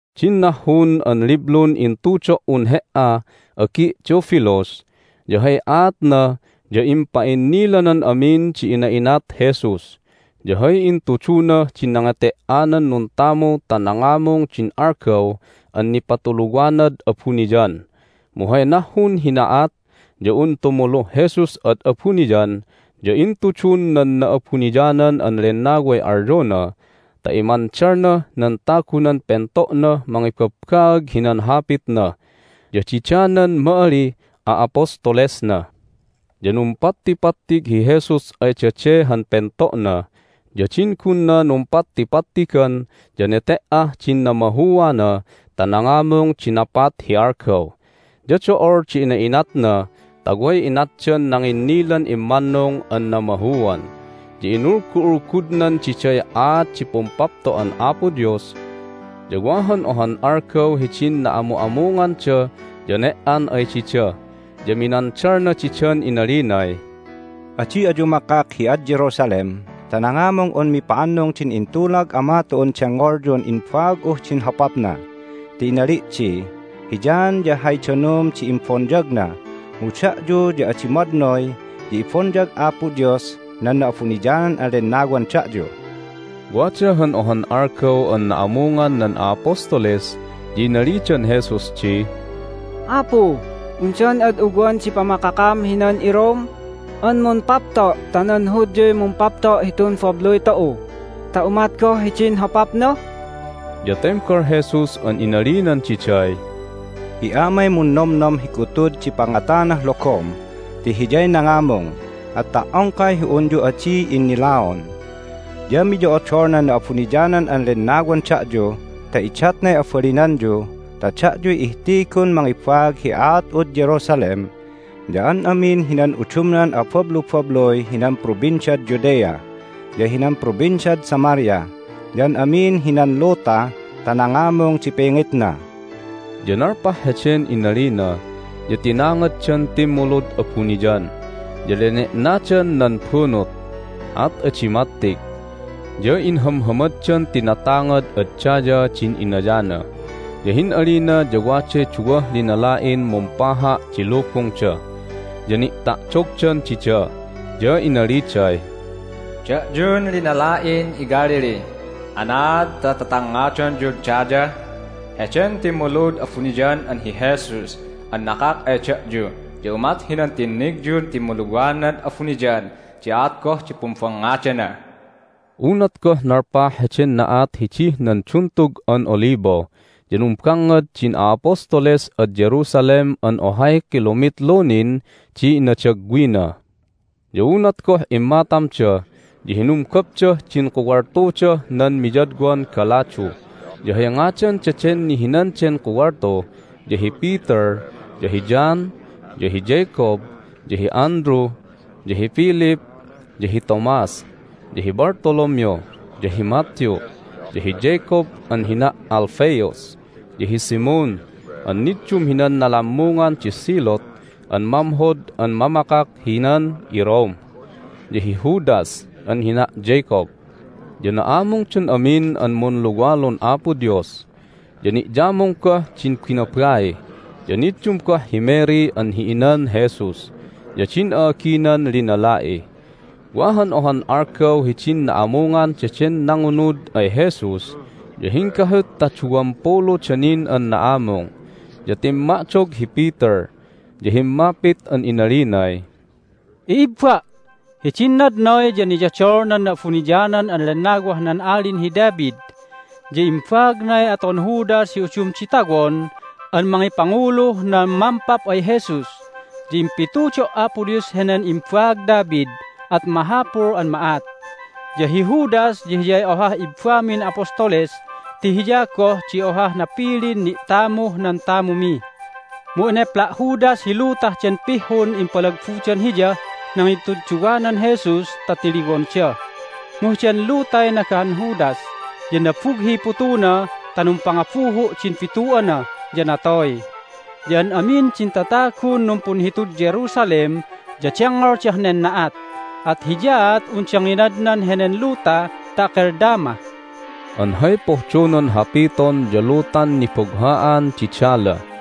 Din nahhun an liblun intudo"un he"a, agi' Theophilus, ya hay aatna ya impa'innilanan amin di ina'inat Jesus, ya hay intudunah din nangete"anan nuntamu ta nangamung din algaw an nipatuluwanad abuniyan. Mu hay nahhun hi na'at ya un tumuluh Jesus ad abuniyan ya intudun nan Na'abuniyanan an Lennaway alyona ta imandalnah nan tagunan pento'nah mangibabbaag hinan Hapitna, ya dida nan ma'alih a'apostolesna. Ya numpattipattig hi Jesus ay dade han pento'na, ya din gunna numpattipattigan ya nete"ah din namahuana ta nangamung di napat hi algaw. Ya do'ol di ina'inatna ta way inatdan nanginnilan immannung an namahuan, ya inulgu'ulgudnan diday aat di Pumpapto'an Apo Dios. Ya wa han ohan algaw hidin na'amu'amunganda ya ne"an ay dida, ya minandalna didan inalinay, "Adi ayu makak hi ad Jerusalem ta nangamung un mipa'annung din intulag Ama tu'un dengngolyun imbaag'uh din hopapna, ti inali' di, Hi John ya hay danum di imbonyagna, mu da'yu ya adi madnoy ya ibonyag Apo Dios nan Na'abuniyanan an Lennawan da'yu." Wada han ohan algaw an na'amungan nan a'apostoles ya inalidan Jesus di, "Apu, undan ad ugwan di pamakakam hinan iRome an mumpapto' ta nan Hudyuy mumpapto' hitun babluy tu'u ta umat goh hidin hopapna?" Ya tembal Jesus an inalinan diday, "Hi Amay munnomnom hi gutud di pangatanah logom ti Hiyay nangamung, at ta"ongkay hi unyu adi innilaon. Ya miyo'odol nan Na'abuniyanan an Lennawan da'yu ta idatnay abalinanyu ta da'yuy ihtigun mangibaag hi aat'ud Jerusalem, ya an amin hinan udumnan abablubabluy hinan Provinciad Judea, ya hinan Provinciad Samaria, ya an amin hinan luta ta nangamung di pingitna." Ya nalpah heden inalina ya tinangaddan timmulud abuniyan, ya lene'nadan nan bunut, at adi mattig. Ya inhamhamaddan tinatangad ad dayah din inayana, ya hin'alina ya waday duwah linala'in mumpaha' di lubungda, ya ni'ta'dogdan dida. Ya inaliday, "Da'yun linala'in iGalilee, anaad ta tatangngadonyud daya? Heden timmulud abuniyan an hi Jesus an nakak ay da'yu ya umat hinan tinnigyun timmuluwanad abuniyan di aat goh di pumbangngadana." Unat goh nalpah heden na'at hidih nan Duntug an Olibo ya numbangngad din a'apostoles ad Jerusalem an ohay kilomitlu nin di inadagwina. Ya unat goh immatamda ya hinumgopdah din kuwaltudah nan miyadwan galadu. Ya hay ngadan daden nihinan den kuwaltu ya hi Peter, ya hi John, ya hi Jacob, ya hi Andrew, ya hi Philip, ya hi Thomas, ya hi Bartholomew, ya hi Matthew, ya hi Jacob (an hina' Alphaeus), ya hi Simon (an niddum hinan nalammungan di Zealot an mamhod an mamakak hinan iRome), ya hi Judas (an hina' Jacob). Ya na'amungdan amin an munluwalun Apo Dios, ya ni'yamung goh din binabai, ya niddum goh hi Mary an hi inan Jesus, ya din a'aginan linala'i. Wa han ohan algaw hidin na'amungan daden nangunud ay Jesus ya hinggahut ta duwampuluda nin an na'amung. Ya timma'dog hi Peter, ya himmapit an inalinay, "I'ibba', hidin nadnoy ya niyodol nan Na'abuniyanan an Lennawah nan Alin hi David, ya imbaagnay aton Judas hi udum di tawon an mangipanguluh nan mampap ay Jesus. Ya impitudo' Apo Dios henen imbaag David, at mahapul an ma'at. Ya hi Judas ya hiyay ohah ibbamin apostoles ti hiya goh di ohah napilin ni'tamuh nan tamumi. Mu enepla' Judas hi lutah den pihhun impalagbudan hiyah nangituduwanan Jesus ta tiliwonda. Mu heden lutay nagahan Judas, ya nabughiy putuna, at numpangabuhu' din bitu'ana, ya natoy. Ya an amin din tatagun numpunhitud Jerusalem ya dengngoldah nen na'at, at hiyaat unda nginadnan henen luta ta Akeldama" (an hay pohdonan hapiton ya Lutan Nibugha'an di Dala).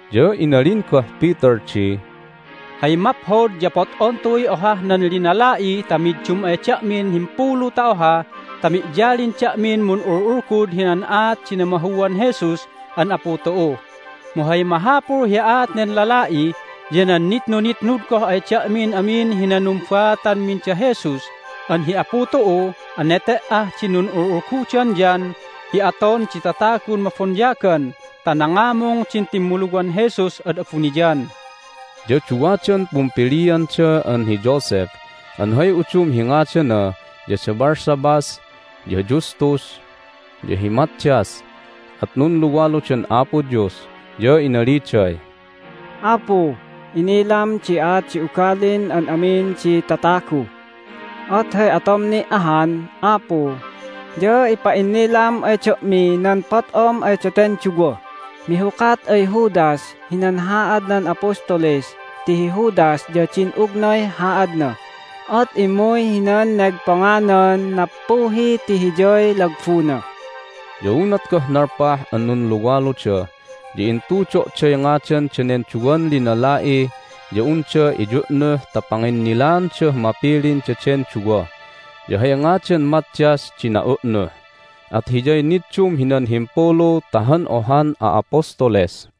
Ya inalin goh Peter di, "Hay maphod ya pot'on tu'uy ohah nan linala'i ta middum ay da'min himpulu ta oha ta mi'yalin da'min mun'ul'ulgud hinan aat di namahuan Jesus an Apu tu'u. Mu hay mahapul hi aat nen lala'i ya nan nitnunitnud goh ay da'min amin hinan numbaatanmin da Jesus an hi Apu tu'u an nete"ah din nun'ul'ulgudan John hi aton di tatagun mabonyagan ta nangamung din timmuluwan Jesus ad abuniyan." Ya duwadan pumpilianda an hi Joseph (an hay udum hi ngadana ya Barsabbas ya Justus) ya hi Mattias. At nunluwaludan Apo Dios, ya inaliday, "Apu, inilam di aat di ugalin an amin di tatagu. At hay atom ni' ahan, Apu, ya ipa'innilam ay da'mi nan pot'om ay daten duwah mihukat ay Judas hinan haadnan apostoles ti hi Judas ya din'ugnay haadna, at immuy hinan negponganan nappuhi ti hiyay lagbuna." Ya unat goh nalpah an nunluwaluda ya intudo'day ngadan danen duwan linala'i ya unda iyu'nuh ta panginnilaandah mapilin daden duwa. Ya hay ngadan Mattias di na'u'nuh, at hiyay niddum hinan himpulu ta han ohan a'apostoles.